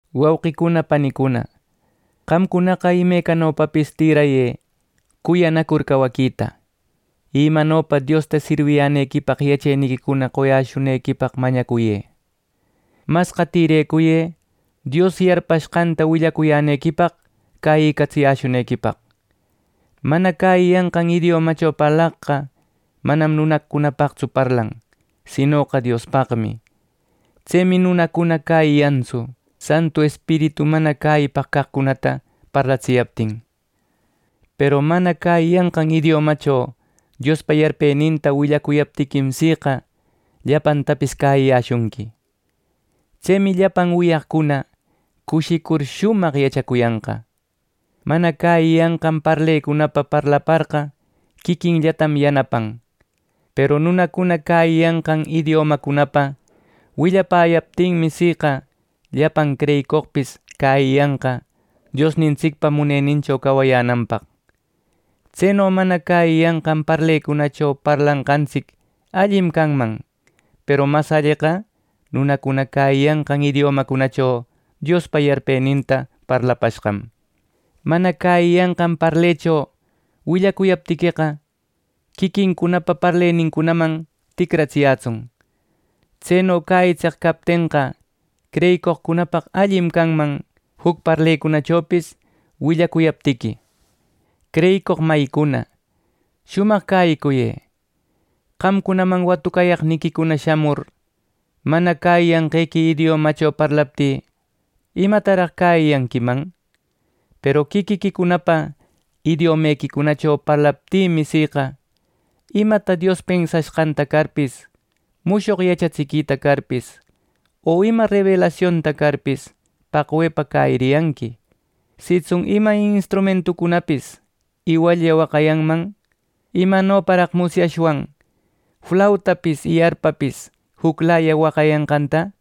Wauqicuna panicuna, qamcunaqa imecanopapis tïrayë cuyanacur cawaquita. Y imanopa Diosta sirwiyänequipaq yacheniquicuna qoyäshunequipaq mañacuyë. Masqa tïrecuyë Dios yarpashqanta willacuyänequipaq cäyïcatsiyäshunequipaq. Mana cäyiyanqan idiomacho parlaqqa manam nunacunapaqtsu parlan, sinoqa Diospaqmi. Tsemi nunacuna cäyiyantsu, Santu Espiritu mana cäyipaq caqcunata parlatsiyaptin. Peru nunacuna cäyiyanqan idiomacho Diospa yarpeninta willacuyaptiquim, siqa llapantapis cäyiyäshunqui. Tsemi llapan wiyaqcuna cushicur shumaq yachacuyanqa. Mana cäyiyanqan parlecunapa parlaparqa quiquinllatam yanapan. Peru nunacuna cäyiyanqan idiomancunapa willapäyaptinmi, siqa llapan creyicoqpis cäyiyanqa Diosnintsicpa munenincho cawayänanpaq. Tseno mana cäyiyanqan parlecunacho parlanqantsic allim canman. Peru mas alleqa nunacuna cäyiyanqan idiomacunacho Diospa yarpeninta parlapashqam. Mana cäyiyanqan parlecho willacuyaptiqueqa, quiquincunapa parlenincunaman ticratsiyätsun. Tseno cäyitseq captenqa, creyicoqcunapaq allim canman juc parlecunachopis willacuyaptiqui. Creyicoq mayicuna, shumaq cäyicuyë. Qamcunaman watucaqniquicuna shamur mana cäyiyanqequi idiomacho parlaptï, ¿imataraq cäyiyanquiman? Peru quiquiquicunapa idiomequicunacho parlaptïmi, siqa imata Dios pensashqanta carpis, mushoq yachaquita carpis, o ima rebelasionta carpis, paqwepa cäyiriyanqui. Sitsun ima instrumentucunapis iwallla waqayanman, ¿imanoparaq musyashwan flautapis y arpapis juclaya waqayanqanta!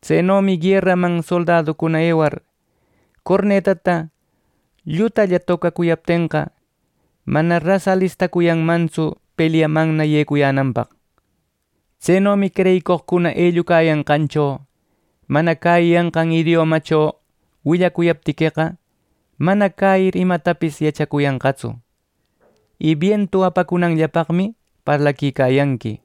Tsenomi gueraman soldaducuna ewar cornetata llutalla tocacuyaptenqa, mana ras alistacuyanmantsu pelyamanna yecuyänanpaq. Tsenomi creyicoqcuna ellucayanqancho mana cäyiyanqan idiomacho willacuyaptiqueqa, mana cäyir imatapis yachacuyanqatsu, y bientu apacunanllapaqmi parlaquicayanqui.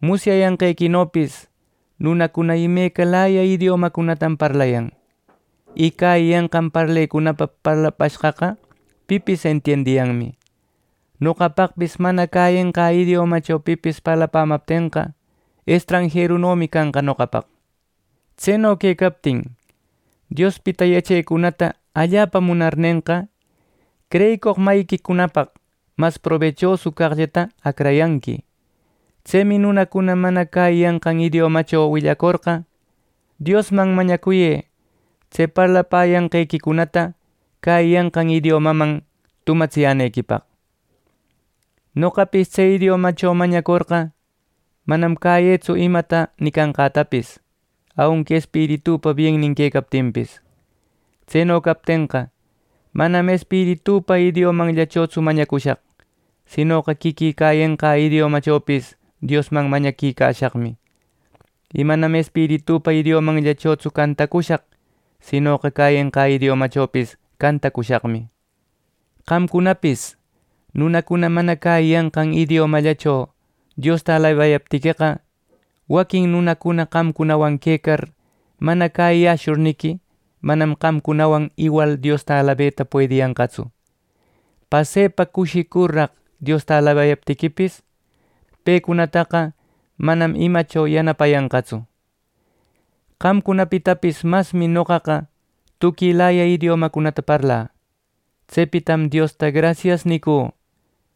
Musyanqantsicnopis nunacuna imecalaya idiomacunatam parlayan. Y cäyiyanqan parlecunapa parlapashqaqa pipis entiendiyanmi. Noqapaqpis mana cäyenqä idiomacho pipis parlapämaptenqa, estranjerunomi canqa noqapaq. Tseno quecaptin, Diospita yachecunata allapa munarnenqa, creyicoq mayiquicunapaq mas probechoso caqllata acrayanqui. Tsemi nunacuna mana cäyiyanqan idiomacho willacorqa, Diosman mañacuyë tse parlapäyanqequicunata cäyiyanqan idiomaman tumatsiyänequipaq. Noqapis tse idiomacho mañacorqa, manam cäyëtsu imata nicanqätapis aunqui espiritüpa biennin quecaptinpis. Tseno captenqa, manam espiritüpa idiomanllachotsu mañacushaq, sinoqa quiquï cäyenqä idiomachopis Diosman mañaquicashaqmi. Y manam espiritüpa idiomanllachotsu cantacushaq; sinoqa cäyenqä idiomachopis cantacushaqmi. Qamcunapis nunacuna mana cäyiyanqan idiomallacho Diosta alabayaptiqueqa, waquin nunacuna qamcunawan quecar mana cäyiyäshurniqui, manam qamcunawan iwal Diosta alabeta puediyanqatsu. Pasepa cushicurraq Diosta alabayaptiquipis, pecunataqa manam imacho yanapayanqatsu. Qamcunapitapis masmi noqaqa tuquilaya idiomacunata parlä. Tsepitam Diosta “Grasias” nicü.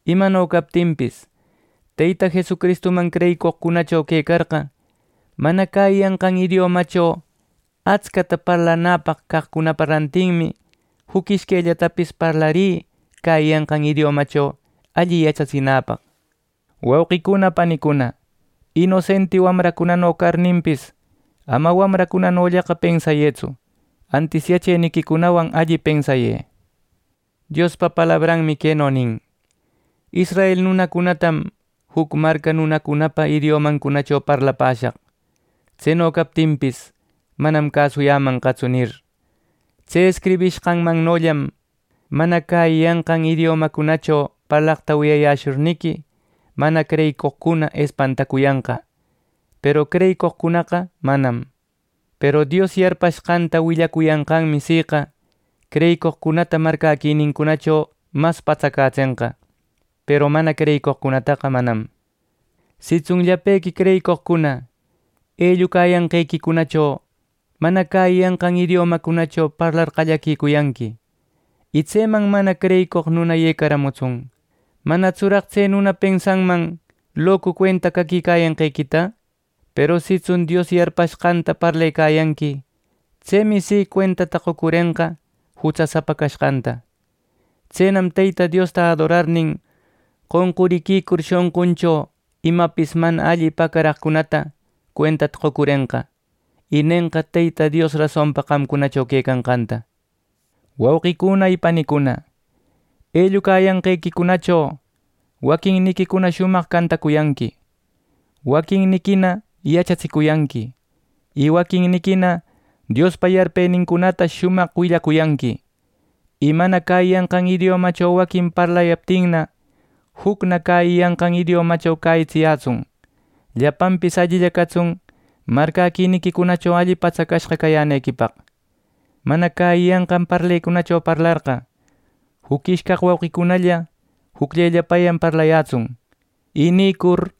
Imano captinpis, Teyta Jesucristuman creyicoqcunacho quecarqa, mana cäyiyanqan idiomacho atscata parlanäpaq caqcunapa rantinmi, juc ishquellatapis parlarï cäyiyanqan idiomacho alli yachatsinäpaq. Wauquicuna panicuna, inosenti wamracunano carninpis, ama wamracunanollaqa pensayëtsu, antis yacheniquicunawan alli pensayë. Diospa palabranmi queno nin: “Israel nunacunatam juc marca nunacunapa idiomancunacho parlapäshaq. Tseno captinpis, manam cäsuyämanqatsu” nir. Tse escribiranqannollam mana cäyiyanqan idiomacunacho parlaqta wiyayäshurniqui, mana creyicoqcuna espantacuyanqa; peru creyicoqcunaqa manam. Peru Dios yarpashqanta willacuyanqanmi siqa creyicoqcunata marcäquinincunacho mas patsacätsenqa peru mana creyicoqcunataqa manam. Sitsun llapequi creyicoqcuna ellucayanqequicunacho mana cäyiyanqan idiomacunacho parlar qallaquicuyanqui, y tseman mana creyicoq nuna yecaramutsun, manatsuraq tse nuna pensanman locu cuenta caquicayanquequita. Peru sitsun Dios yarpashqanta parlecayanqui, tsemi si, cuenta qocurenqa jutsasapa canqanta. Tsenam Teyta Diosta adorarnin, qonquriquicur shonquncho imapis mana alli pacaraqcunata cuentata qocurenqa, y nenqa Teyta Dios rasonpa qamcunacho quecanqanta. Wauquicuna y panicuna, ellucayanqequicunacho waquinniquicuna shumaq cantacuyanqui, waquinniquina yachatsicuyanqui, y waquinniquina Diospa yarpenincunata shumaq willacuyanqui. Y mana cäyiyanqan idiomacho waquin parlayaptinna, jucna cäyiyanqan idiomacho cäyitsiyätsun. Llapanpis allilla catsun marcäquiniquicunacho alli patsacashqa cayänequipaq. Mana cäyiyanqan parlecunacho parlarqa, juc ishcaq wauqicunalla jucllellapayan parlayätsun. Y nïcur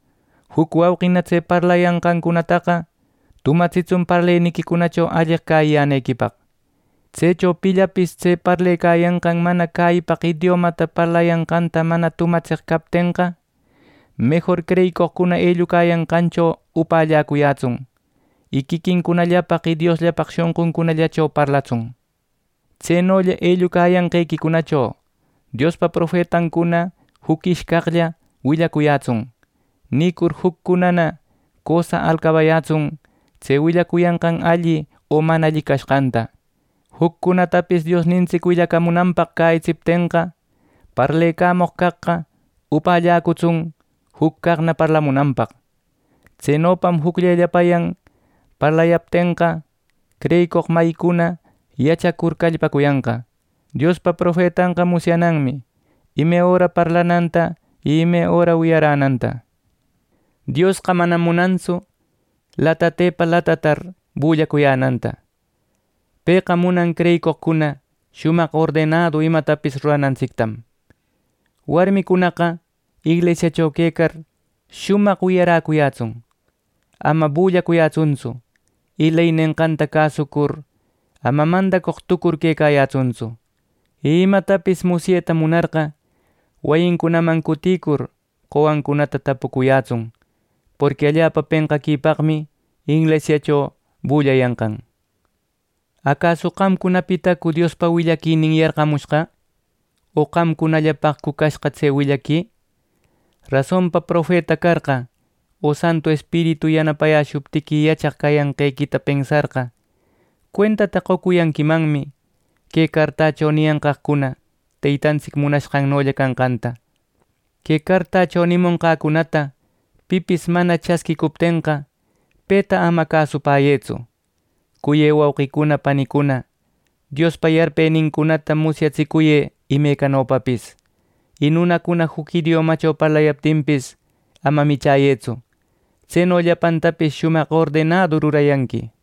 juc wauqina tse parlayanqancunataqa tumatsitsun parleniquicunacho alleq cäyiyänequipaq. Tsecho pillapis tse parlecayanqan mana cäyipaq idiomata parlayanqanta mana tumatseq captenqa, mejor creyicoqcuna ellucayanqancho upällacuyätsun, y quiquinllapaq y Diosllapaq shonquncunallacho parlatsun. Tsenolla ellucayanqequicunacho Diospa profetancuna juc ishcaqlla willacuyätsun. Nicur juccunana cösa alcabayätsun tse willacuyanqan alli o mana alli cashqanta. Juccunatapis Diosnintsic willacamunanpaq cäyitsiptenqa, parlecamoq caqqa upälläcutsun juc caqna parlamunanpaq. Tsenopam jucllellapayan parlayäptenqa, creyicoq mayincuna yachacur callpacuyanqa. Diospa profetanqa musyananmi ime öra parlananta y ime öra wiyaränanta. Diosqa manam munantsu latatepa latatar bullacuyänanta. Pëqa munan creyicoqcuna shumaq ordenadu imatapis ruranantsictam. Warmicunaqa inglisiacho quecar shumaq wiyaräyätsun; ama bullayätsuntsu, y ley nenqanta cäsucur, ama mandacoq tucur quecayätsuntsu. Y imatapis musyeta munarqa, wayincunaman cutïcur qowancunata tapucuyätsun. Porqui allapa penqaquipaqmi inglisiacho bullayanqan. ¿Acasu qamcunapitacu Diospa willaquinin yarqamushqa, o qamcunallapaqcu cashqa tse willaqui! Rasonpa profeta carqa o Santu Espiritu yanapayäshuptiqui yachaq cayanqequita pensarqa, cuentata qocuyanquimanmi que cartacho niyanqaqcuna Teytantsic munanqannolla canqanta. Que cartacho nimonqäcunata pipis mana chasquïcuptenqa, peta ama cäsupäyëtsu. Cuyë wauqicuna panicuna, Diospa yarpenincunata musyatsicuyë imecanopapis; y nunacuna juc idiomacho parlayaptinpis, ama michäyëtsu. Tseno llapantapis shumaq ordenadu rurayanqui.